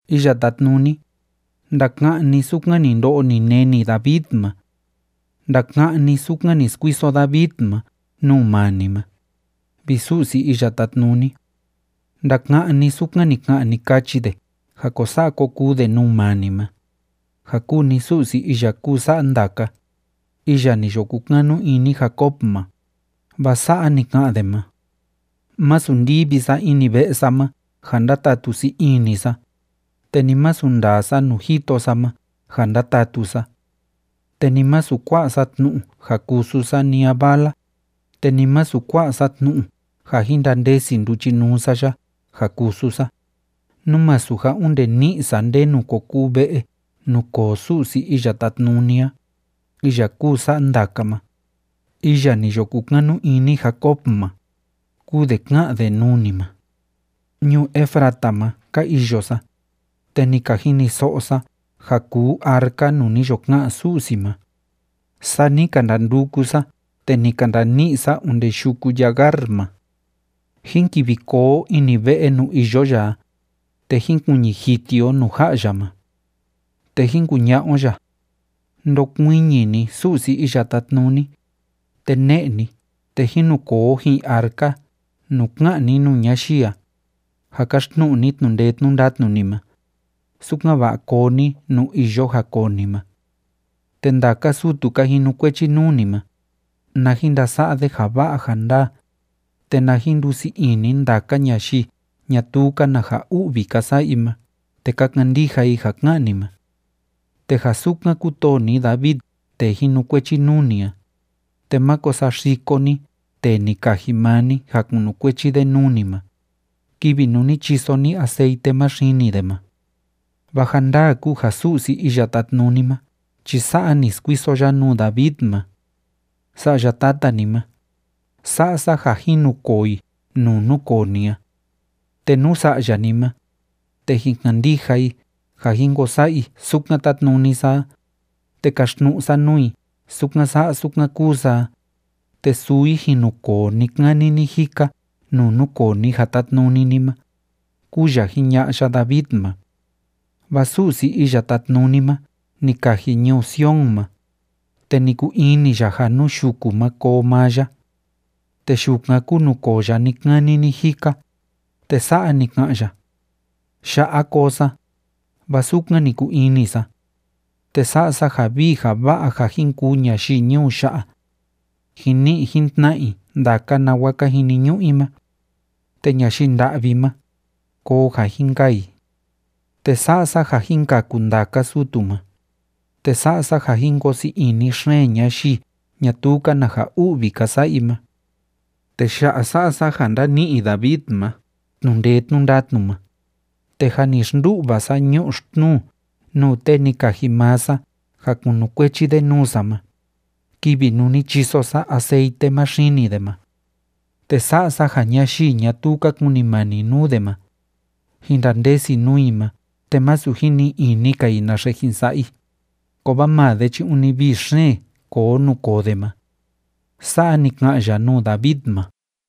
Iya Tátnuni, ndaka'án ni sukan ni ndo'o ni neni David ma. Ndaka'án ni sukan ni skuiso David ma nuu maa ni ma, vi Su'si Iya Tátnuni. Ndaka'án ni sukan ni ka'an, ni kachi de ja ko sa'a ko kuu de nuu maa ni ma, ja kúu ni Su'si iya kúu sa'a ndaka, iya ni yo kukanu ini Jacob ma, vaa sa'a ni ka'an de ma: “Masu ndivi sa ini ve'e sa ma ja ndatatu sii ini sa, te ni masu ndaa sa nuu jito sa ma ja ndatatu sa. Te ni masu kua'a sa tnu'u ja kusu sa ni a vala, te ni masu kua'a sa tnu'u ja jin ndandesi nduchinuu sa ya ja kusu sa, nú masu ja onde ni'i sa ndenu ko kuu ve'e nuu koo Su'si Iya Tátnuni a, iya kúu sa'a ndaka ma, iya ni yo kukanu ini Jacob ma”, kúu de ká'an de nuu ni ma. Ñuu Efrata ma ka iyo sa, te ni ka jiniso'o sa ja kuu arca nuu ni yo ka'an Su'si ma, saa ni ka ndanduku sa te ni ka ndani'i sa onde yuku Yagar ma. Jín kivi koo o ini ve'e nuu iyo ya a, te jín kuiñi jiti o nuu ja'a ya ma. Te jín kuña'a o ya: “Ndokuiñi ni, Su'si Iya Tátnuni, te ne'e ni te jín nu koo o ji'in arca nuu ká'an ni nuu ñayii a, ja káxtnu'u ni tnu'u ndee tnu'u ndatnu ni ma, sukan‑va'a koo ni nuu iyo ja koo ni ma. Te ndaka sutu ka jinukuechi nuu ni ma, na jin ndasa'a de ja va'a ja ndaa, te na jin ndusii ini ndaka ñayii ñatuu‑ka na ja u'vi ka sa'a i ma te ka kandija i ja ká'an ni ma. Te ja sukan kútoo ni David tee jinukuechi nuu ni a, te máko saxiko ni tee ni kaji maa ni ja kunukuechi de nuu ni ma, kivi nuu ni chiso ni aceite ma xini de ma.” Vaa ja ndaa kúu ja Su'si Iya Tátnuni ma chi sa'a ni skuiso ya nuu David ma: “Sa'ya tata ni ma, sa'a sa ja jin nukoo i nuu núkoo ni a. Te nú sa'ya ni ma, te jin kandija i ja jin ko sa'a i sukan tátnuni sa a, te kaxtnu'u sa nuu i sukan sa'a sukan kúu sa a, te suu i jin nukoo ni‑kani ni‑jika nuu núkoo ni ja tátnuni ni ma”, kúu ya jiña'a ya David ma. Vaa Su'si Iya Tátnuni ma ni kaji ñuu Sion ma, te ni kuu ini ya ja nuu yuku ma koo maa ya. Te yukan kúu nuu koo ya ni‑kani ni‑jika, te sa'a ni ka'an ya: “Ya'a koo sa, vaa sukan ni kuu ini sa. Te sa'a sa ja vii ja va'a ja jin kuu ñayii ñuu ya'a. Jin ni'i jin tna'a i ndaka nawa ka jiniñu'u i ma. Te ñayii nda'vi ma, koo ja jin kaa i. Te sa'a sa ja jin kaku ndaka sutu ma, te sa'a sa ja jin koo sii ini xeen ñayii ñatuu‑ka na ja u'vi ka sa'a i ma. Te ya'a sa'a sa ja ndani'i David ma tnu'u ndee tnu'u ndatnu ma, te jâ ni xndu'va sa ñu'u xtnuu nuu tee ni kaji maa sa ja kunukuechi de nuu sa ma, kivi nuu ni chiso sa aceite ma xini de ma. Te sa'a sa ja ñayii ñatuu ka kunimani nuu de ma, jin ndandesi nuu i ma te masu jin ni'i ini‑ka i naxe jin sa'a i, kovaa maa de chi ûni vii xeen koo nuu koo de ma.” Sa'a ni ka'an ya nuu David ma.